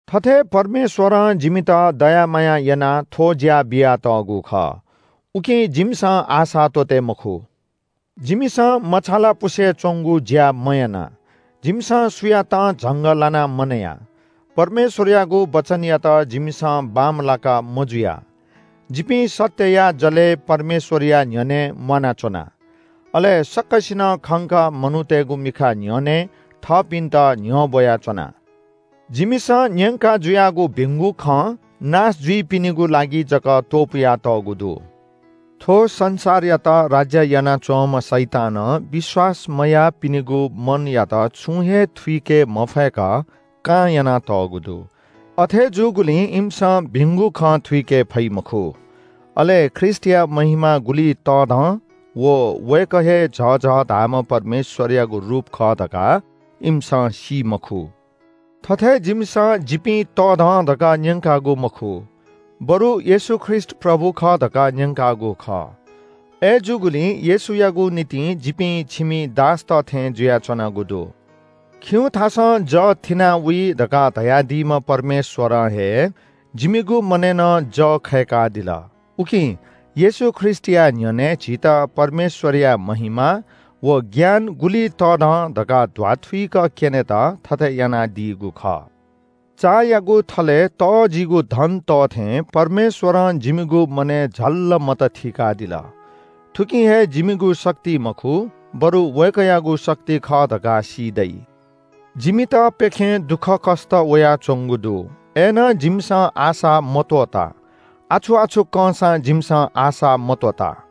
थथे परमेश्‍वरं जिमित दया माया यानाः थ्‍व ज्‍या बियातःगु खः। उकिं जिमिसं आशा त्‍वःते मखु। जिमिसं मछालापुसे च्‍वंगु ज्‍या मयाना। जिमिसं सुयातं झंगः लानाः मनया। परमेश्‍वरयागु वचनयात जिमिसं बांमलाका मजुया। जिपिं सत्‍यया जलय् परमेश्‍वरया न्‍ह्यःने म्‍वानाच्‍वना। अले सकसिनं खंक मनूतय्‌गु मिखा न्‍ह्यःने थःपिन्‍त न्‍ह्यब्‍वयाच्‍वना। जिमिसं न्‍यंका जुयागु भिंगु खँ नाश जुइपिनिगु लागि जक त्‍वपुयातःगु दु। थ्‍व संसारया द्यवं विश्‍वास मयाःपिनिगु मनयात छुं हे थुइके मफय्‌क कां यानातःगु दु। अथे जूगुलिं इमिसं भिंगु खँ थुइके फइ मखु। अले ख्रीष्‍टया महिमा गुलि तःधं व वय्‌कः हे झःझः धाःम्‍ह परमेश्‍वरयागु रूप खः धकाः इमिसं सी मखु। थथे जिमिसं “जिपिं तःधं” धकाः न्‍यंकागु मखु, बरु येशू ख्रीष्‍ट “प्रभु खः” धकाः न्‍यंकागु खः। अय्‌जूगुलिं येशूयागु निंतिं जिपिं छिमि दासत थें जुयाच्‍वनागु दु। “खिउँथासं जः थिनावइ” धकाः धयादीम्‍ह परमेश्‍वरं हे जिमिगु मनय् नं जः खय्‌कादिल। उकिं येशू ख्रीष्‍टया न्‍ह्यःने झीत परमेश्‍वरया महिमा व ज्ञान गुलि तःधं धकाः ध्‍वाथुइक क्‍यनेत थथे यानादीगु खः। चायागु थलय् तःजिगु धन तः थें परमेश्‍वरं जिमिगु मनय् झल्‍ल मत थीकादिल। थुकिं हे जिमिगु शक्ति मखु, बरु वय्‌कःयागु शक्ति खः धकाः सी दइ। जिमित प्‍यखें दुःखकष्‍ट वयाच्‍वंगु दु। अय्‌नं जिमिसं आशा मत्‍वःता। आछु-आछु कंसां जिमिसं आशा मत्‍वःता।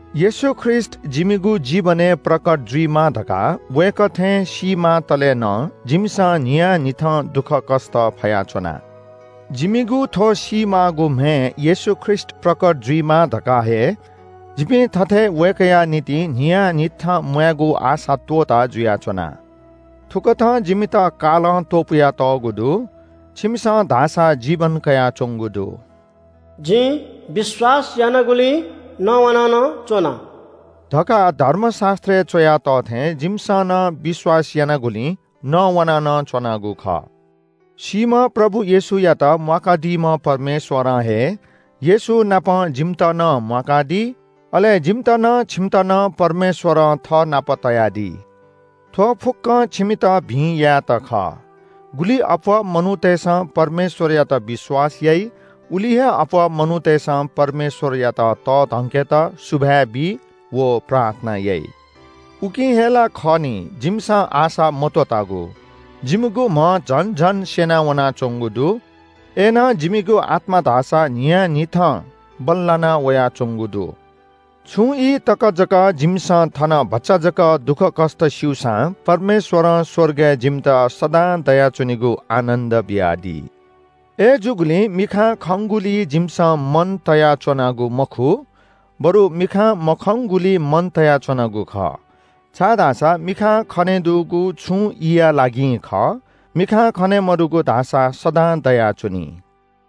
येशू ख्रीष्‍ट जिमिगु जीवनय् प्रकट जुइमा धकाः वय्‌कः थें सीमातले नं जिमिसं न्‍हियान्‍हिथं दुःखकष्‍ट फयाच्‍वना। जिमिगु थ्‍व सीमाःगु म्‍हय् येशू ख्रीष्‍ट प्रकट जुइमा धकाः हे जिपिं थथे वय्‌कःया निंतिं न्‍हियान्‍हिथं म्‍वायेगु आशा त्‍वःताः जुयाच्‍वना। थुकथं जिमित कालं त्‍वपुयातःगु दु। छिमिसं धाःसा जीवन कयाच्‍वंगु दु। “जिं विश्‍वास यानागुलिं नवाना नं च्‍वना” धकाः धर्मशास्‍त्रय् च्‍वया तः थें जिमिसं नं विश्‍वास यानागुलिं नवाना नं च्‍वनागु खः। सीम्‍ह प्रभु येशूयात म्‍वाकादीम्‍ह परमेश्‍वरं हे येशूनापं जिमित नं म्‍वाकादी। अले जिमित नं छिमित नं परमेश्‍वरं थःनाप तयादी। थ्‍व फुक्‍कं छिमित भिं यायेत खः। गुलि अप्‍वः मनूतय्‌सं परमेश्‍वरयात विश्‍वास याइ, उलि हे अप्‍वः मनूतय्‌सं परमेश्‍वरयात तःधंकेत सुभाय् बी व प्रार्थना याइ। उकिं हे ला खः नि, जिमिसं आशा मत्‍वःतागु। जिमिगु म्‍ह झन झन स्‍यनावनाच्‍वंगु दु। अय्‌नं जिमिगु आत्‍मा धाःसा न्‍हियान्‍हिथं बल्‍लाना वयाच्‍वंगु दु। छुं ई तक जक जिमिसं थन भचा जक दुःखकष्‍ट स्‍यूसां परमेश्‍वरं स्‍वर्गय् जिमित सदां दयाच्‍वनीगु आनन्‍द बियादी। अय्‌जूगुलिं मिखां खंगुलिइ जिमिसं मन तयाच्‍वनागु मखु, बरु मिखां मखंगुलिइ मन तयाच्‍वनागु खः। छाय्‌धाःसा मिखां खनेदुगु छुं ईया लागिं खः, मिखां खने मदुगु धाःसा सदां दयाच्‍वनी।